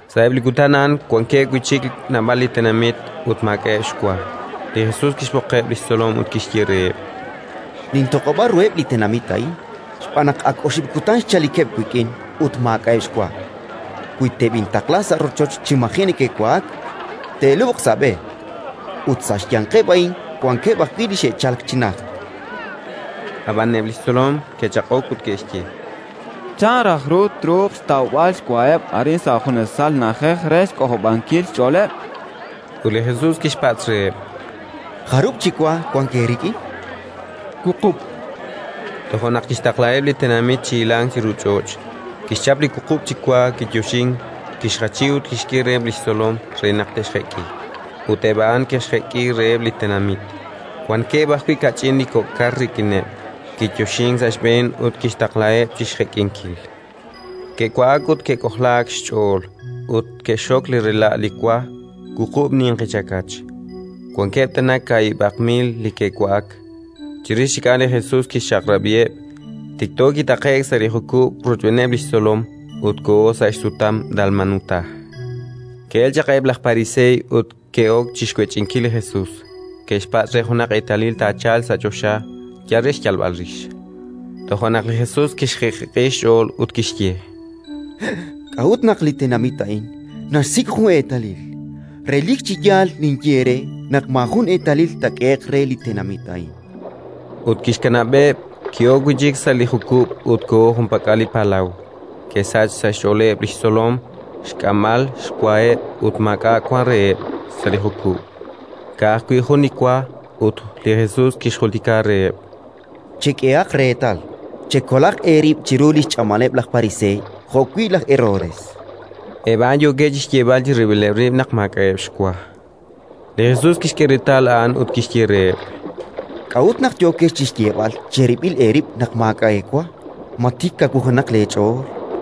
Sa'eb' li kutan a'an wankeb' wi' chik naab'al li tenamit ut maak'a'eb' xwa. Li Jesus kixb'oqeb' li xtzolom ut kixye reheb': —Nintoq'ob'a ruheb' li tenamit a'in, xb'aan naq ak oxib' kutan xchalikeb' wik'in ut maak'a'eb' xwa. Wi teb'intaqla sa' rochocheb' chi maji' neke'wa'ak, te'lub'q sa' b'e; ut sa' xyanqeb' a'in wankeb' ajwi' li xe'chalk chi najt. Ab'an eb' li xtzolom ke'chaq'ok ut ke'xye: —Chan raj ru truuq xtawb'al xwaheb' arin, sa' junesal na'ajej, re xk'ojob'ankil xch'ooleb'? Ut li Jesus kixpatz' reheb': —Jarub' chi wa wank eerik'in? —Wuqub', chankeb'. Toja' naq kixtaqlaheb' li tenamit chi hilank chiru ch'och'; kixchap li wuqub' chi wa, kiyoxink, kixjachi ut kixk'e reheb' li xtzolom re naq te'xjek'i: ut eb' a'an ke'xjek'i reheb' li tenamit. Wankeb' ajwi' kach'in li kok' kar rik'ineb': kiyoxink sa' xb'een ut kixtaqlaheb' chi xjek'inkil. Ke'wa'ak ut ke'k'ojlaak xch'ool; ut ke'xxok li rela' li wa: wuqub' ninqi chakach. Wankeb' tana kaahib'aq mil li ke'wa'ak. Chirix chik a'an li Jesus kixchaq'rab'iheb'; tikto kitaqe'k sa' li jukub' rochb'eeneb' li xtzolom ut koho sa' xsutam Dalmanutá. Ke'elk chaq eb' laj Pariseey ut ke'ok chi xwech'inkil li Jesus: ke'xpatz' re junaq eetalil taachalq sa' choxa, yal re xyalb'al rix. Toja' naq li Jesus kixjiq'jiq'i xch'ool ut kixye: —K'a'ut naq li tenamit a'in naxsik' jun li eetalil? Relik chi yaal ninye eere naq maajun eetalil taak'ehe'q re li tenamit a'in. Ut kixkanab'eb'; ki'ok wi' chik sa' li jukub' ut koho junpak'al li palaw. Ke'sachk sa' xch'ooleb' li xtzolom xk'amb'al xwaheb' ut maak'a' wank reheb' sa' li jukub', ka'ajwi' jun li wa. Ut li Jesus kixjultika reheb': —Chek'ehaq reetal, chekolaq eerib' chiru li xch'amaleb' laj Pariseey jo'wi' laj Herodes. Eb' a'an yookeb' chi xyeeb'al chirib'ileb' rib' naq maak'a'eb' xwa. Li Jesus kixk'e reetal a'an ut kixye reheb': —K'a'ut naq yookex chi xyeeb'al cherib'il eerib' naq maak'a' eewa? Ma tik kawujenaq leech'ool?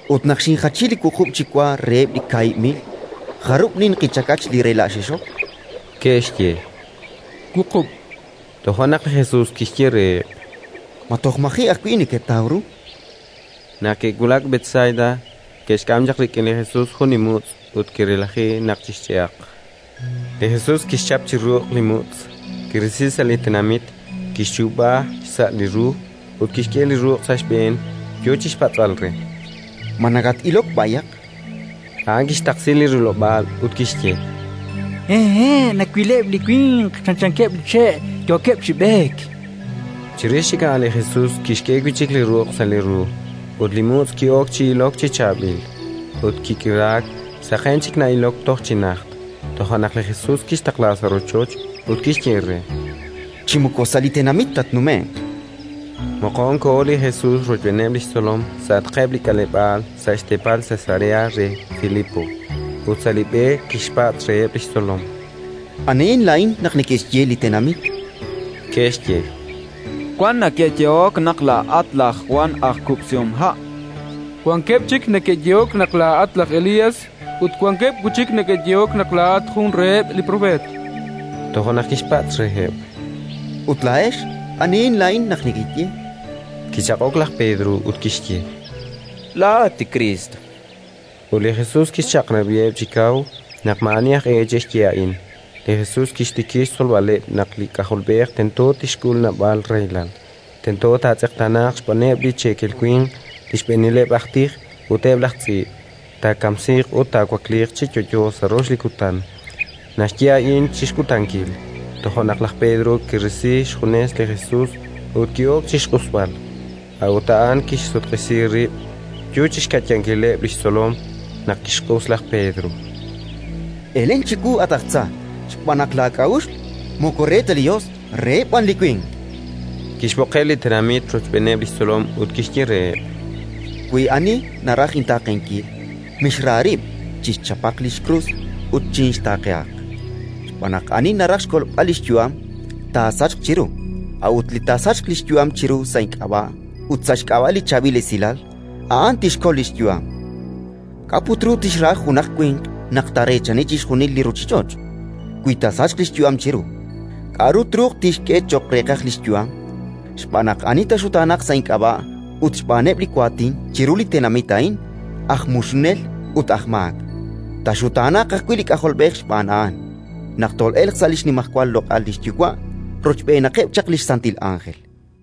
—Ut naq xinjachi li wuqub' chi wa reheb' li kaahib' mil, jarub' ninqi chakach li rela' xexok? Ke'xye: —Wuqub'. Toja' naq li Jesus kixye reheb': —Ma toj maji' ajwi' neketaw ru? Naq ke'wulak Betsaida, ke'xk'am chaq rik'in li Jesus jun li mutz' ut ke'relaji naq chixch'e'aq. Li Jesus kixchap chi ruq' li mutz', kirisi sa' li tenamit, kixchuub'a xsa' li ru ut kixk'e li ruq' sa' xb'een, yo chi xpatz'b'al re: —Ma nakat-ilok b'ayaq? chan re. A'an kixtaqsi li rilob'aal ut kixye: —Nawileb' li winq chanchaneb' li che', yookeb' chi b'eek. Chirix a'an li Jesus kixk'e wi' chik li ruq' sa' li ru, ut li mutz' ki'ok chi ilok chi chaab'il, ut kik'iraak: saqenk chik na'ilok toj chi najt. Toja' naq li Jesus kixtaqla sa' rochoch ut kixye re: —Chi moko sa' li tenamit tatnume'q. Moqon koho li Jesus rochb'eeneb' li xtzolom sa'atqeb' li k'aleb'aal sa' xteepal Cesarea re Filipo. Ut sa' li b'e kixpatz' reheb' li xtzolom: —Anihin laa'in naq neke'xye li tenamit? Ke'xye: —Wan neke'yehok naq laa'at laj Jwan aj kub'sihomha'. Wankeb' chik neke'yehok naq laa'at laj Elías, ut wankeb' wi' chik neke'yehok naq laa'at jun reheb' li propeet. Toja' naq kixpatz' reheb': —Ut laa'ex, anihin laa'in naq nekeye? Kichaq'ok laj Pedro ut kixye: —Laa'at li Kriist. Ut li Jesus kixchaq'rab'iheb' chi kaw naq maa'ani aj e che'xye a'in. Li Jesus kixtikib' xtzolb'aleb' naq li K'ajolb'ej tento tixk'ul naab'al rahilal, tento taatz'eqtaanaaq xb'aaneb' li cheekel winq, li xb'eenileb' aj tij ut eb' laj tz'iib', taakamsiiq ut taawakliiq chi yo'yo sa' rox li kutan. Naxye a'in chi kutankil. Toja' naq laj Pedro kirisi xjunes li Jesus ut ki'ok chi xq'usb'al. A'ut a'an kixsutq'isi rib', yo chi xka'yankileb' li xtzolom naq kixq'us laj Pedro: —Elen chiwu, at aj tza, xb'aan naq laak'a'uxl moko re ta li Yos, reheb' b'an li winq, chan. Kixb'oqeb' li tenamit rochb'eeneb' li xtzolom ut kixye reheb': —Wi ani naraj intaaqenkil, mixra rib', chixchapaq li xkrus ut chinxtaaqehaq. Xb'aan naq ani naraj xkolb'al li xyu'am, taasachq chiru; a'ut li taasachq li xyu'am chiru sa' ink'ab'a' ut sa' xk'ab'a' li Chaab'il Esilal, a'an tixkol li xyu'am. K'a' put ru tixra junaq winq naq taareechani chixjunil li ruuchich'och', wi taasachq li xyu'am chiru? K'aru truuq tixk'e cho'q reeqaj li xyu'am? Xb'aan naq ani taaxutaanaq sa' ink'ab'a' ut xb'aaneb' li waatin chiru li tenamit a'in aj muxunel ut aj maak, taaxutaanaq ajwi' li K'ajolb'ej xb'aan a'an, naq tol'elq sa' li xnimal xloq'al li xYuwa' rochb'eenaqeb' chaq li santil ánjel.